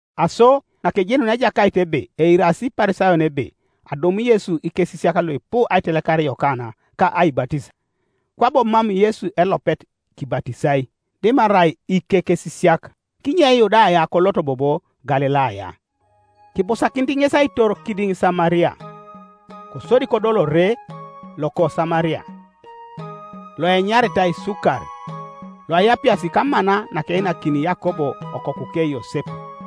Aso nakejenunia Ejakait ebe eirasi Iparisayon ebe adum Yesu ikesisiak luipu aitelekar Yokana ka aibatis, (Kwabo mam Yesu elopet kibatisai, dimarai ikekesisiak,) kinye Yudaya kolot bobo Galilaya. Kibusakinit ŋes aitor kidiŋ Samaria. Kosodi kodol ore loko Samaria, loenyaritai Sukar, loaapias kamana nakeinakini Yakob okokuke Yosep.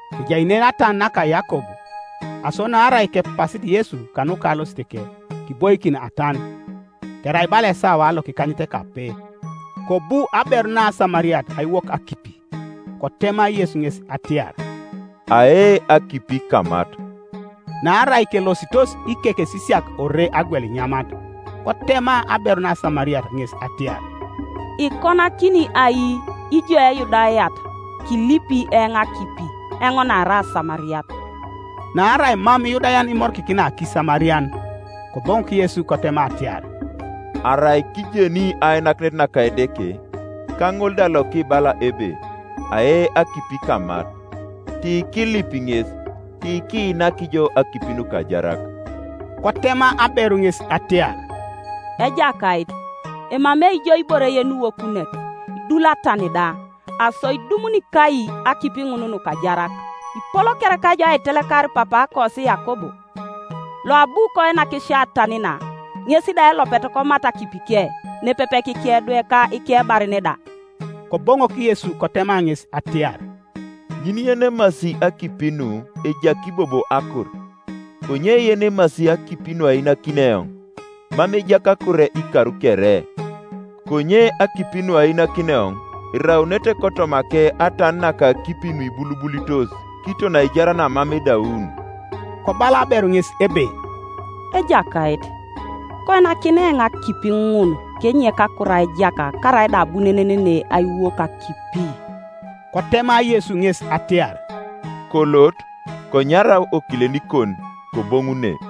Kejai nen atan naka Yakob, aso naarai kepasit Yesu kanuka alositeke, kiboikin atan. Kerai bala esawa lokikanyetekape. Kobu aberu naSamariat aiwok akipi. Kotema Yesu ŋes atiar, “Ae akipi kamat.” Naarai kelositos ikekesisiak ore agwel inyamat. Kotema aberu naSamariat ŋes atiar, “Ikonakini ai ijo Eyudayat kilipi eoŋ akipi, eoŋ naarai Asamariat?” Naarai mam Iyudayan imorikikina kIsamarian. Koboŋok Yesu kotema atiar, “Arai kijeni ainakinet naka Edeke, ka ŋol da lokibala ebe, Ae akipi kamat, tikilipi ŋes, tikiinak jo akipi nukajarak.” Kotema aberu ŋes atiar, “Ejakait, emamei jo ibore yeniwokunet, idul atan da; aso idumuni kai akipi ŋun nukajarak? Ipol kereka ijo aitelekarit papaakosi Yakob, loabu koinak sio atan na, ŋes da elopet komat akipike, nepepe kikedwe, ka ikebaren da?” Koboŋok Yesu kotema ŋes atiar, “Ŋin yenemasi akipi nu ejaki bobo akur, konye yenemasi akipi nuainakini eoŋ, mam ejaki akur ikar kere; konye akipi nuainakini eoŋ eraunete kotomake atan naka akipi nuibulubulitos kiton aijar namam edaun.” Kobala aberu ŋes ebe, “Ejakait, koinakinai eoŋ akipi ŋun kenyek akur aijak, karaida abunenen ne aiwok akipi.” Kotema Yesu ŋes atiar, “Kolot, konyarau okilenikon, koboŋu ne,”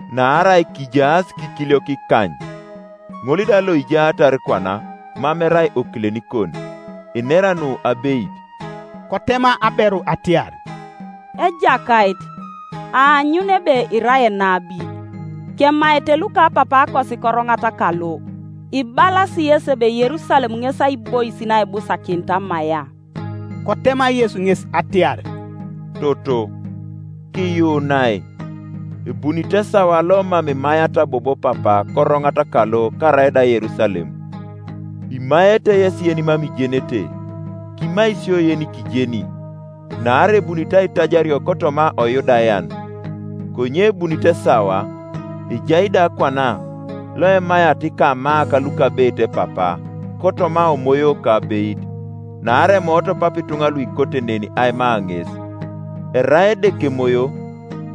naarai kijaas kikiliok ikany, ŋol da loijaatar kwana mam erai okilenikon; inera nu abeit.” Kotema aberu atiar, “Ejakait, aanyun ebe irai enabi. Kemaete lukapapaakosi koroŋat kalo; ibalasi yesi ebe Yerusalem ŋes aibois naibusakinit amaia.” Kotema Yesu ŋes atiar, “Toto, kiyuunai, ebunit esawa lomam imaiata bobo Papa koroŋat kalo karaida Yerusalem. Imaete yesi yenimam ijenete; kimai isio yenikijeni, naarai ebunit aitajario kotoma oYudayan. Konye ebunit esawa, ejai da kwana, loemaiata ikamaak lukabeit Papa, kotoma omoyo ka abeit, naarai emoot Papa ituŋa luikote nen aima ŋes. Erai Edeke Emoyo,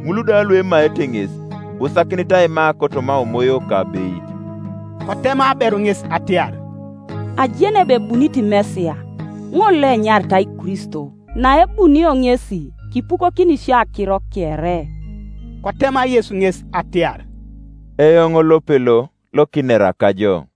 ŋul da luemaete ŋes, ibusakinit aima kotoma omoyo ka abeit.” Kotema aberu ŋes atiar, “Ajeni ebe ebunit Mesia (ŋol Ioenyaritai Kristo); naebunio ŋesi kipukokini sio akiro kere.” Kotema Yesu ŋes atiar, “Eoŋ lopelo lokinera kajo.”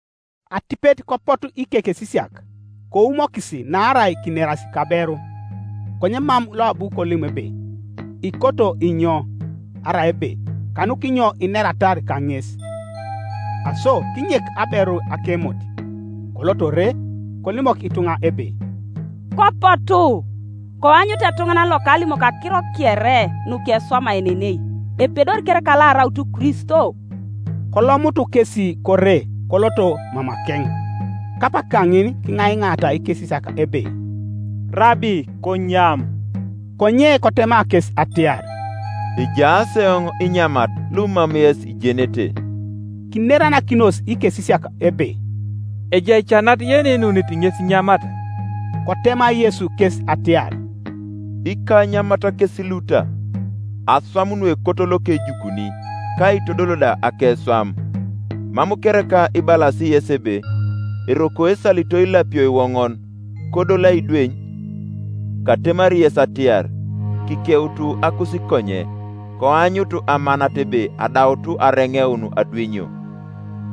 Atipet kopotu ikekesisiak, koumokis naarai kineras kaberu, konye mam loabu kolim ebe, “Ikoto inyo?” Arai ebe, “Kanukinyo ineratar kaŋes?” Aso kinyek aberu akemot, kolot ore, kolimok ituŋa ebe, “Kopotu, koanyut etuŋanan lokalimoki akiro kere nukeswamaenenei. Epedori kereka lo araut Kristo?” Kolomutu kesi kore koloto mamakeŋ. Kapak kaŋin kiŋaiŋaata ikesisiak ebe, “Rabi, konyam.” Konye kotema kes atiar, “Ejaas eoŋ inyamat lumam yes ijenete.” Kineranakinos ikesisiak ebe, “Ejai ca nat yeneinunit ŋes inyamat?” Kotema Yesu kes atiar, “Ikanyamat kes luta, aswam nuekot lokejukuni, ka aitodol da akeswam. Mam kereka ibalasi yesi ebe, ‘Eroko esalito ilapio iwoŋon, kodoli aidweny’? Katemari yes atiar, Kikeutu akusikonye, koanyut amanat ebe adaut areŋeun adwenyio,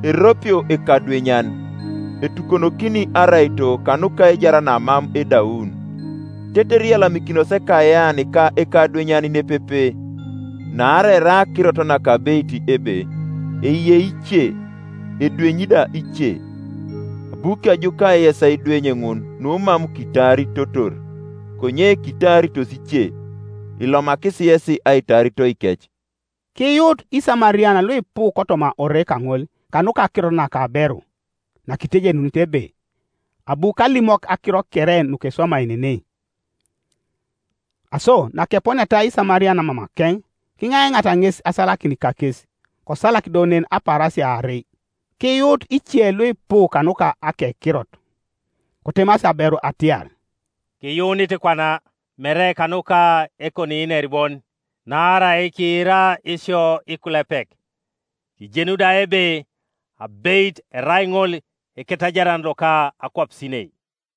Eropio ekadwenyan, etukonokini araito kanuka aijar namam edaun, tetere iyalamikinos ekayean ka ekadwenyan nepepe. Naarai erai akirot nakabeit ebe, ‘Eyei ice, edwenyi da ice.’ Abu kejuka yes aidweny ŋun numam kitaaritotor; konye kitaaritos ice, ilomakis yesi aitaaritoikec.” Kiyuut Isamarian luipu kotoma ore kaŋol kanuka akirot naka aberu, nakitejenunit ebe, “Abu kalimok akiro kere nukeswamaenenei.” Aso nakeponiata Isamarian mamakeŋ, kiŋaiŋaata ŋes asalakin kakes; kosalak do nen apaarasia aarei. Kiyuut ice luipu kanuka akekirot. Kotemasi aberu atiar, “Kiyuunit kwana, mere kanuka ekoniiner bon, naarai kiira isio ikulepek, kijenu da ebe abeit erai ŋol Eketajaran loka akwapisinei.”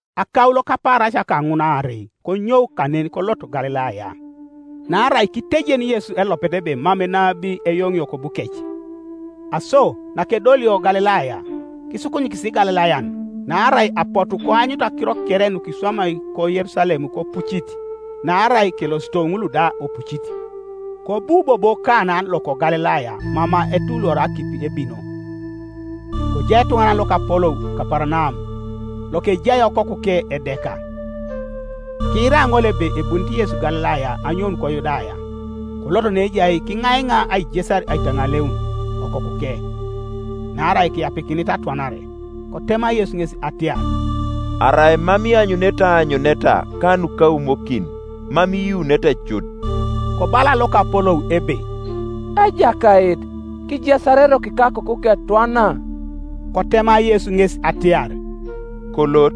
Akaulo kapaarasia kaŋun aarei konyou kanen kolot Galilaya. Naarai kitejen Yesu elopet ebe mam enabi eyoŋio kobukec. Aso nakedolio Galilaya, kisukunyikis Igalilayan, naarai apotu koanyutu akiro kere nukiswamai koYerusalem kopucit, naarai kelosito ŋul da opucit. Kobu bobo Kana loko Galilaya mama etuluoria akipi ebino. Kojai etuŋanan lokapolou Kaparanaum, lokejai okokuke edeka. Kiira ŋol ebe ebunit Yesu Galilaya anyoun koYudaya, kolot neejai kiŋaiŋa aijesar aitaŋaleun okokuke, naarai keapikinit atwanare. Kotema Yesu ŋes atiar, “Arai mam ianyunete aanyuneta ka nukaumokin, mam iyuunete cut.” Kobala lokapolou ebe, “Ejakait, kijesar eroko ikakoku ketwana.” Kotema Yesu ŋes atiar, “Kolot;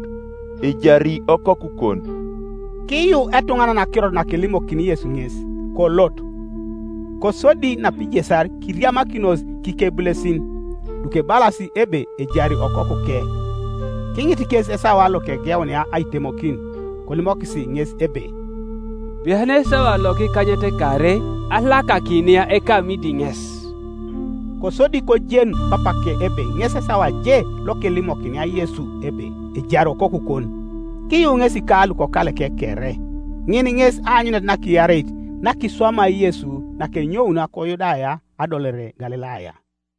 ejari okokukon.” Kiyuu etuŋanan akirot nakelimokini Yesu ŋes, kolot. Kosodi napijesar kiriamakinos kikebulesin, lukebalas ebe ejari okokuke. Kiŋit kes esawa lokegeunia aitemokin, kolimokis ŋes ebe, “Bian esawa lokikanyetekaarei alakakinia ekamidi ŋes.” Kosodi kojen papake ebe ŋes esawa je lokelimokinia Yesu ebe, “Ejari okokukon.” Kiyuu ŋesi ka lukokaleke kere. Ŋin ŋes aanyunet nakiareit nakiswamai Yesu nakenyounio koYudaya adolore Galilaya.